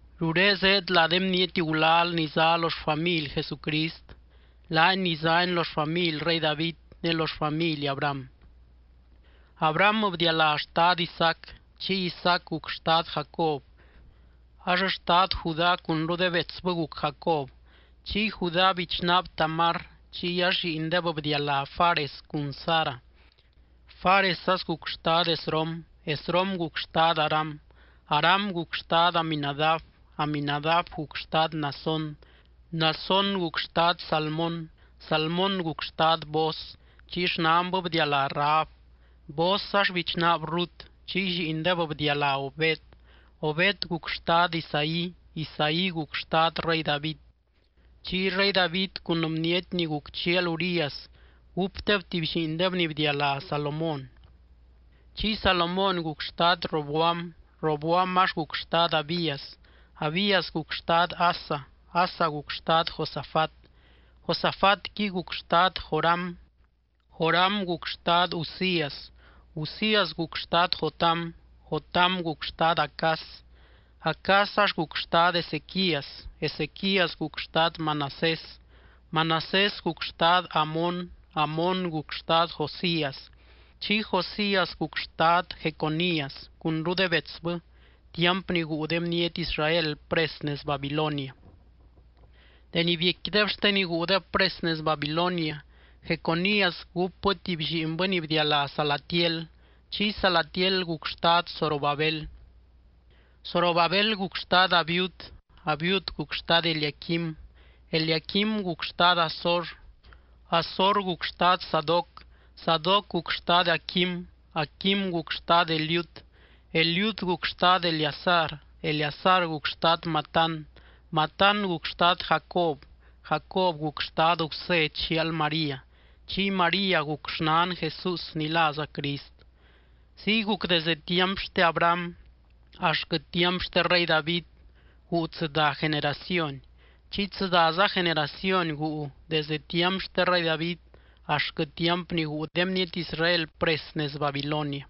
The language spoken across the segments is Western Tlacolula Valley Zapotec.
Ruré zéed lá de bniety gulal ni zá lo xfamily Jesucrist, laany ni zány lo xfamily rey David ne lo xfamily Abraham: Abraham bdialá xtad Isaac, chiy Isaac guc xtad Jacob. Ax xtad Judá cunru de betsbɨ guc Jacob. Chiy Judá bichnaab Tamar, chiy ax lliindeb bdialá Fares cun Zara. Fares ax guc xtad Esrom, Esrom guc xtad Aram, Aram guc xtad Aminadab, Aminadab guc xtad Naasón, Naasón guc xtad Salmón. Salmón guc xtad Booz, chiy xnanbɨ bdialá Rahab. Booz ax bichnaab Rut, chiy lliindeb bdialá Obed. Obed guc xtad Isaí, Isaí guc xtad rey David. Chiy rey David cun bniety ni guc chial Urías gúpdeb tuby lliindeb ni bdialá Salomón. Chiy Salomón guc xtad Roboam, Roboam ax guc xtad Abías, Abías guc xtad Asa. Asa guc xtad Josafat, Josafatqui guc xtad Joram, Joram guc xtad Uzías. Uzías guc xtad Jotam, Jotam guc xtad Acaz. Acaz ax guc xtad Ezequías, Ezequías guc xtad Manasés, Manasés guc xtad Amón, Amón guc xtad Josías, chiy Josías guc xtad Jeconías cunru de betsbɨ tiamp ni guu de bniety Israel pres nez Babilonia. Deni biecquideb xte ni guudeb pres nez Babilonia, Jeconías gúpbɨ tuby lliinbɨ ni bdialá Salatiel. Chiy Salatiel guc xtad Zorobabel. Zorobabel guc xtad Abiud, Abiud guc xtad Eliaquim, Eliaquim guc xtad Azor, Azor guc xtad Sadoc, Sadoc guc xtad Aquim, Aquim guc xtad Eliud, Eliud guc xtad Eleazar, Eleazar guc xtad Matán. Matán guc xtad Jacob. Jacob guc xtad Gusé chial María. Chiy María guc xnan Jesús ni láza Crist. Ziy guc desde tiamp xte Abraham axtquɨ tiamp xte rey David guu tsɨdá generación, chiy tsɨdáza generación guu desdɨ tiamp xte rey David axtquɨ tiamp ni guu de bniety Israel pres nez Babilonia.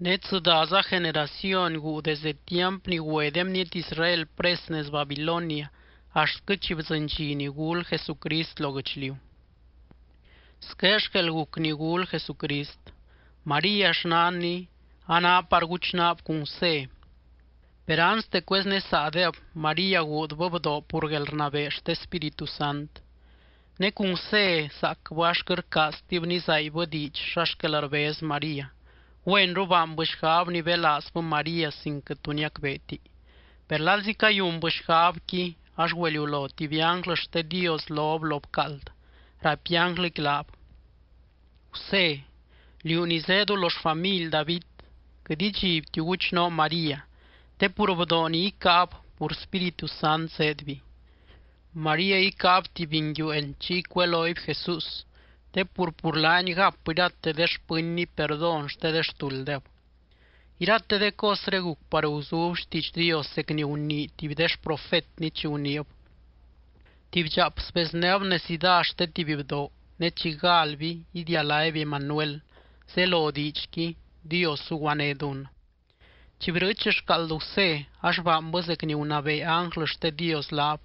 Ne tsɨdáza generación guu desde tiamp ni güe de bniety Israel pres nez Babilonia axtquɨ chi bdzɨny dxi ni gul Jesucrist lo guɨchliu. Squé xquel guc ni gul Jesucrist: María, xnanny, a ná par guchnaab cun Gusé. Per anste cueznésaadeb, María guudbɨ bdoo pur guelrnabee xte Spíritu Sant. Ne cun Gusé zaacbɨ ax quɨt rcaaztib nizaaibbɨ diidx xa xquel rbez María, güenru baanbɨ xgab nibelaazbɨ María sin quɨt tu niacbeeti. Per lalzi cayunbɨ xgabqui, ax güeliulo tuby ánglɨ xte Dios lob lo bcaald, raipy ánglɨqui laab: —Gusé, liú ni zéedu lo xfamily David, quɨt idxibtiu guchnoo María te pur bdoo ni icáab pur Spíritu Sant zéedby. María icáab tuby nguiueen chiy cuelooby JESÚS, te pur, pur laany gap irate de xpɨnny perdón xte de xtulddeb. Irate de cosré guc par guzub xtiidx Dios zec ni gunii tuby de xprofetny chi guniib: Tuby dxaap sbeznéb necidá xte tuby bdoo ne chi galby idialáby Emanuel, zelo diidxqui: Dios zuguané dunnɨ. Chi brɨɨch xcaald Gusé, ax baanbɨ zec ni gunabee ánglɨ xte Dios laab,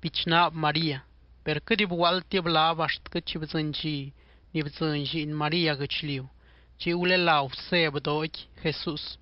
bichnaab María, per quɨt bguaaldtib laab axtquɨ chi bdzɨny dxi bdzɨny lliin María guɨchliu. Chiy gulelá Gusé bdooqui JESÚS.